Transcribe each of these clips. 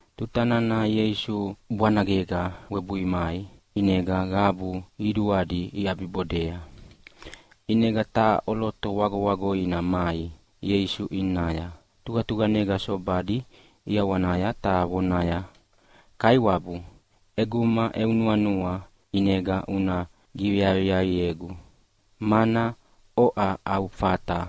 Tuta nana Ieisu bwanagega webui mai ʼinega qabu qiduadi iʼabibodea. ʼInega taha ʼoloto ʼwagoʼwagoina mai Ieisu ʼinaya tuqatuqanega sobadi ʼiawanaya ta vonaya, “Kaiwabu, ʼeguma eu nuanua ʼinega una giveaqiaqiegu, mana oʼa au fata.”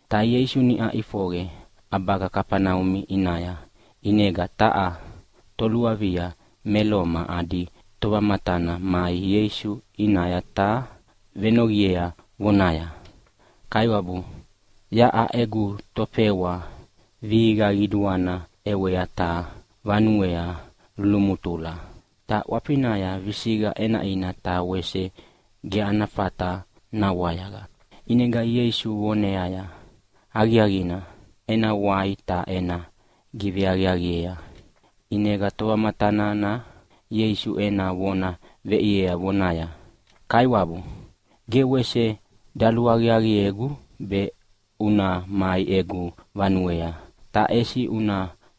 Ta Ieisu niʼa ʼifoqe ʼabaga Kafaneumi ʼinaya, ʼinega taha toluavia me Loma adi tovamatana mai Ieisu ʼinaya ta venoqiea vonaya, “Kaiwabu, taha egu tofewa vihiqa qiduana ʼewea ta vanuea lulumutula. Ta ʼwafinaya visiqa ʼenaʼina, ta wese ge ana fata nawayaqa.” ʼInega Ieisu voneaya, “Aqiaqina, ena wai ta ena giveaqiaqiea.” ʼInega tovamatana nana Ieisu ena vona veʼiea vonaya, “Kaiwabu, ge wese daluaqiaqiegu be una mai egu vanuea, ta ʼesi una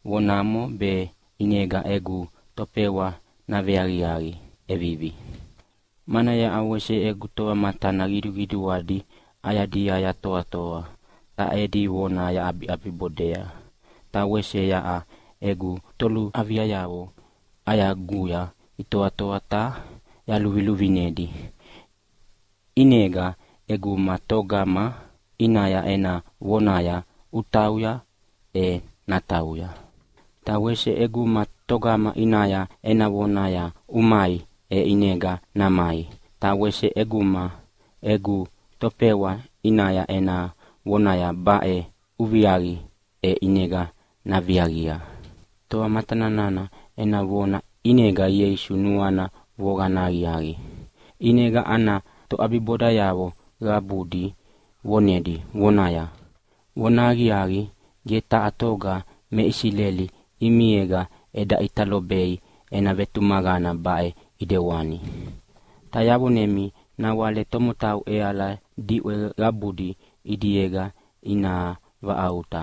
vonamo be ʼinega egu tofewa naveaqiaqi ʼevivi. Mana yaʼa wese egu tovamatana qiduqiduadi ʼayadia yatoatoa, ta edi vona yaʼabiʼabibodea, ta wese yaʼa egu toluaviayavo ʼayaguya itoatoa ta yaluviluvinedi. ʼInega ʼeguma togama ʼinaya ena vonaya, ‘Utauya!’ e natauya. Ta wese ʼeguma togama ʼinaya ena vonaya, ‘Umai!’ e ʼinega namai, ta wese ʼeguma egu tofewa ʼinaya ena vonaya, ‘Baʼe uviaqi!’ e ʼinega naviaqia.” Tovamatana nana ena vona ʼinega Ieisu nuana voqana aqiaqi, ʼinega ana toʼabibodayavo qabudi vonedi, vonaya, “Vonahaqiaqi, ge taha toga me Isileli ʼimiega eda ʼita lobei ena vetumaqana baʼe ʼidewani. Ta yavonemi nawale tomotau ʼeala diʼwe qabudi ʼidiega ina vaʼauta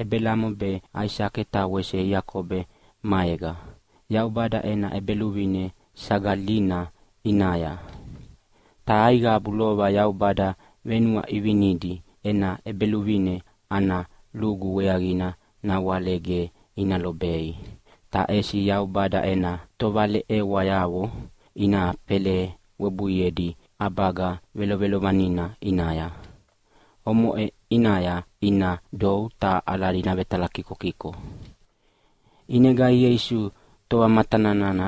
Ebelamo be Aisake ta wese Iakobo maega Yaubada ena ʼEbeluvine sagalina ʼinaya. Ta aiqabu lova Yaubada venuaʼivinidi ena ʼEbeluvine ana lugu weaqina nawale ge ina lobei, ta ʼesi Yaubada ena tovaleʼewayavo ina fela webuiedi ʼabaga velovelovanina ʼinaya. Omoʼe ʼinaya ina dou ta aladi navetalakikokiko.” ʼInega Ieisu tovamatana nana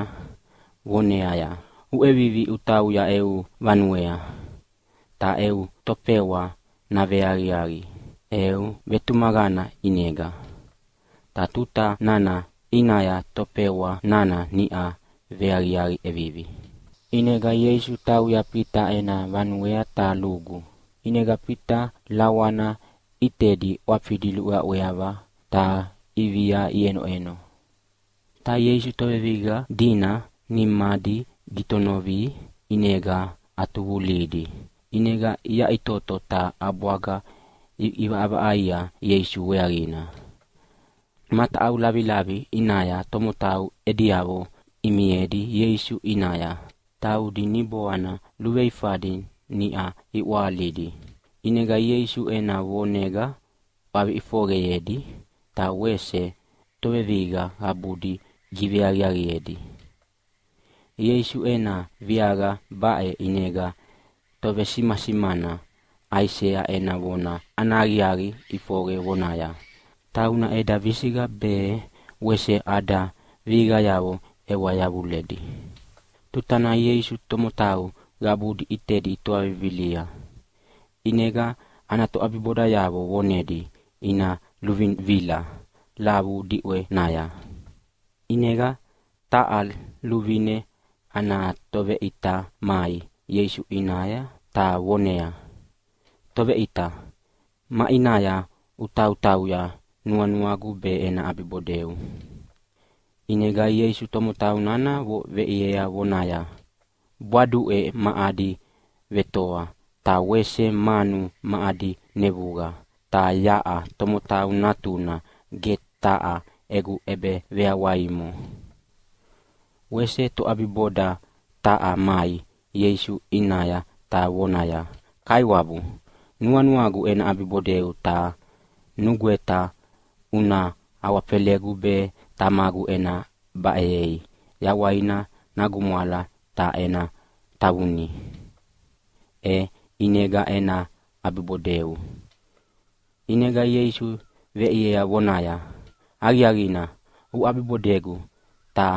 voneaya, “Uʼevivi utauya eu vanuea, ta eu tofewa naveaqiaqi eu vetumaqana ʼinega.” Ta tuta nana ʼinaya tofewa nana niʼa veaqiaqi ʼevivi. ʼInega Ieisu tauya Fita ena vanuea ta lugu, ʼinega Fita lawana ʼitedi ʼwafidi luʼweaʼweava ta ʼivia iʼenoʼeno. Ta Ieisu tovevihiqa dina nimadi gitonovia, ʼinega ʼatuvulihidi. ʼInega iyaʼitoto ta ʼabwaga iʼivaʼavaʼaia Ieisu weaqina. Mataʼau lavilavi ʼinaya tomotau ediavo imiedi Ieisu ʼinaya, taudi niboana luveifadi niʼa iʼwahalidi. ʼInega Ieisu ena vonega ʼwavi ʼifoqeyedi, ta wese tovevihiqa qabudi giveaqiaqiedi. Ieisu ena viaqa baʼe ʼinega tovesimasimana Aisea ena vona ana aqiaqi ʼifoqe vonaya, “Tauna eda visiqa be wese ada vihiqayavo ʼewa yavuledi.” Tuta nana Ieisu tomotau qabudi ʼitedi itoa vivilia ʼinega ana toʼabibodayavo vonedi ina luvivila lavu diʼwenaya. ʼInega taha luvine ana toveʼita mai Ieisu ʼinaya ta voneaya, “Toveʼita, maʼinaya utautauya nuanuagu be ena ʼabibodeu.” ʼInega Ieisu tomotau nana veʼiea vonaya, “Bwaduʼe ma adi vetoa ta wese manu ma adi nevuqa, ta yaʼa Tomotau Natuna ge taha egu ʼebeveyawaimo.” Wese toʼabiboda taha mai Ieisu ʼinaya ta vonaya, “Kaiwabu, nuanuagu ena ʼabibodeu ta nugweta una awafelegu be tamagu ena baʼeyei yawaina nagumwala ta ena tavunia, e ʼinega ena ʼabibodeu.” ʼInega Ieisu veʼiea vonaya, “Aqiaqina uʼabibodegu, ta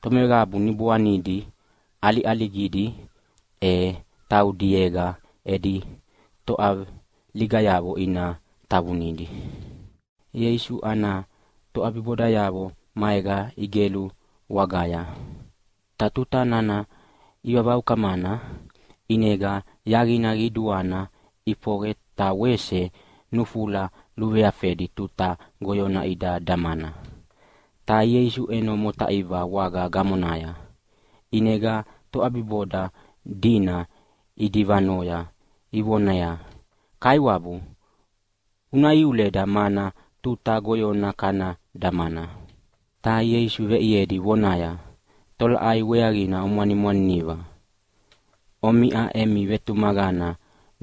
tomeqabu niboanidi ʼaliʼaligidi e taudiega edi toʼaligayavo ina tavunidi.” Ieisu ana toʼabibodayavo maega igelu wagaya, ta tuta nana ivavaukamana ʼinega yaqina qiduana ʼifoqe ta wese nufula luveafedi tuta goyona ida damana. Ta Ieisu ʼeno motaiva waga gamonaya. ʼInega toʼabiboda dina idivanoya ivoneaya, “Kaiwabu, una iuleda mana tuta goyona kana damana!” Ta Ieisu veʼiedi vonaya, “Tolaʼai weaqina omwanimwaniniva? Omiʼa emi vetumaqana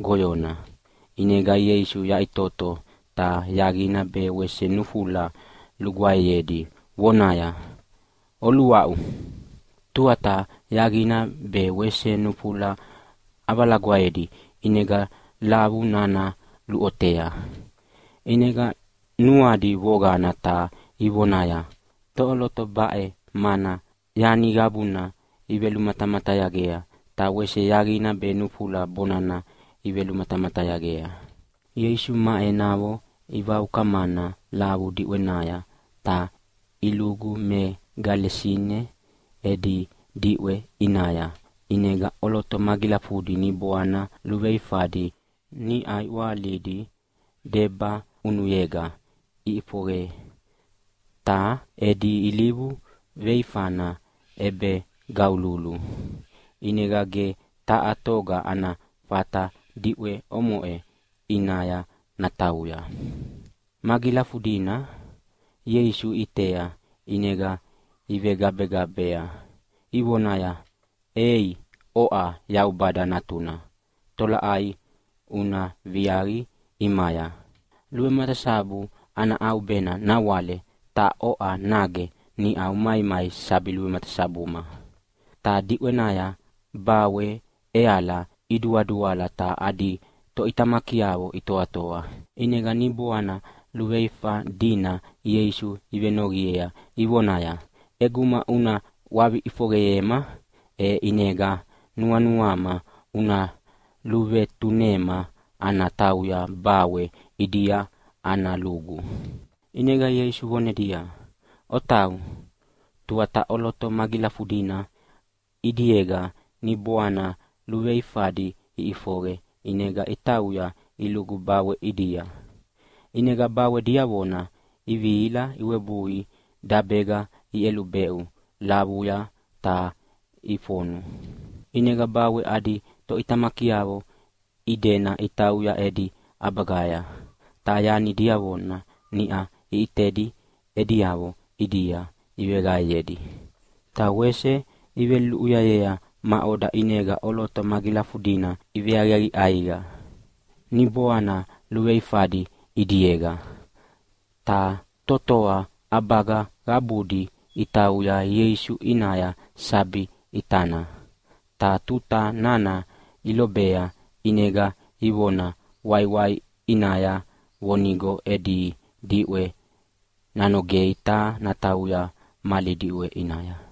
goyona.” ʼInega Ieisu yaʼitoto ta yaqina be wese nufula lugwaeyedi vonaya, “Oluaʼu!” Tuata yaqina be wese nufula ʼavalagwaedi, ʼinega lavu nana luʼotea. ʼInega nuadi voqana ta ivonaya, “Toʼoloto baʼe, mana yani qabuna ivelumatamatayagea, ta wese yaqina be nufula bonana ivematamatayagea?” Ieisu ma enavo ivaukamana lavu diʼwenaya ta ilugu me Gelasine edi diʼwe ʼinaya. ʼInega ʼoloto magilafudi niboana luveifadi niʼa iʼwahalidi debaʼunuyega iʼifoqe. Ta edi ilivu veifana ʼebegaululu ʼinega ge taha toga ana fata diʼwe omoʼe ʼinaya natauya. Magilafudina Ieisu iʼitea ʼinega ivegabegabea ivonaya, “Ei, oʼa Yaubada Natuna, tolaʼai una viaqi ʼimaya? Luvematasabu ana ʼaubena nawale, ta oʼa nage niʼa umaimai sabi luvematasabuma?” Ta diʼwenaya bawe ʼeala iduaduala ta adi toʼitamakiavo itoatoa. ʼInega niboana luveifa dina Ieisu ivenoqiea ivonaya, “ʼEguma una ʼwavi ʼifoqeyema, e ʼinega nuanuama una luvetunema ana tauya bawe ʼidia ana lugu.” ʼInega Ieisu vonedia, “Otau!” Tuata ʼoloto magilafudina ʼidiega niboana luveifadi iʼifoqe ʼinega itauya ilugu bawe ʼidia. ʼInega bawe diavona ivihila iwebui dabega iʼelubeʼu lavuya ta ifonu. ʼInega bawe adi toʼitamakiavo idena itauya edi ʼabagaya, ta yani diavona niʼa iʼitedi ediavo ʼidia iveqaeyedi. Ta wese iveluluʼuyayea maʼoda ʼinega ʼoloto magilafudina iveaqiaqi ʼaiqa niboana luveifadi ʼidiega. Ta totoa ʼabaga qabudi itauya Ieisu ʼinaya sabi ʼitana, ta tuta nana ilobea ʼinega ivona waiwai ʼinaya vonigo edi diʼwe nanogei ta natauya mali diʼwe ʼinaya.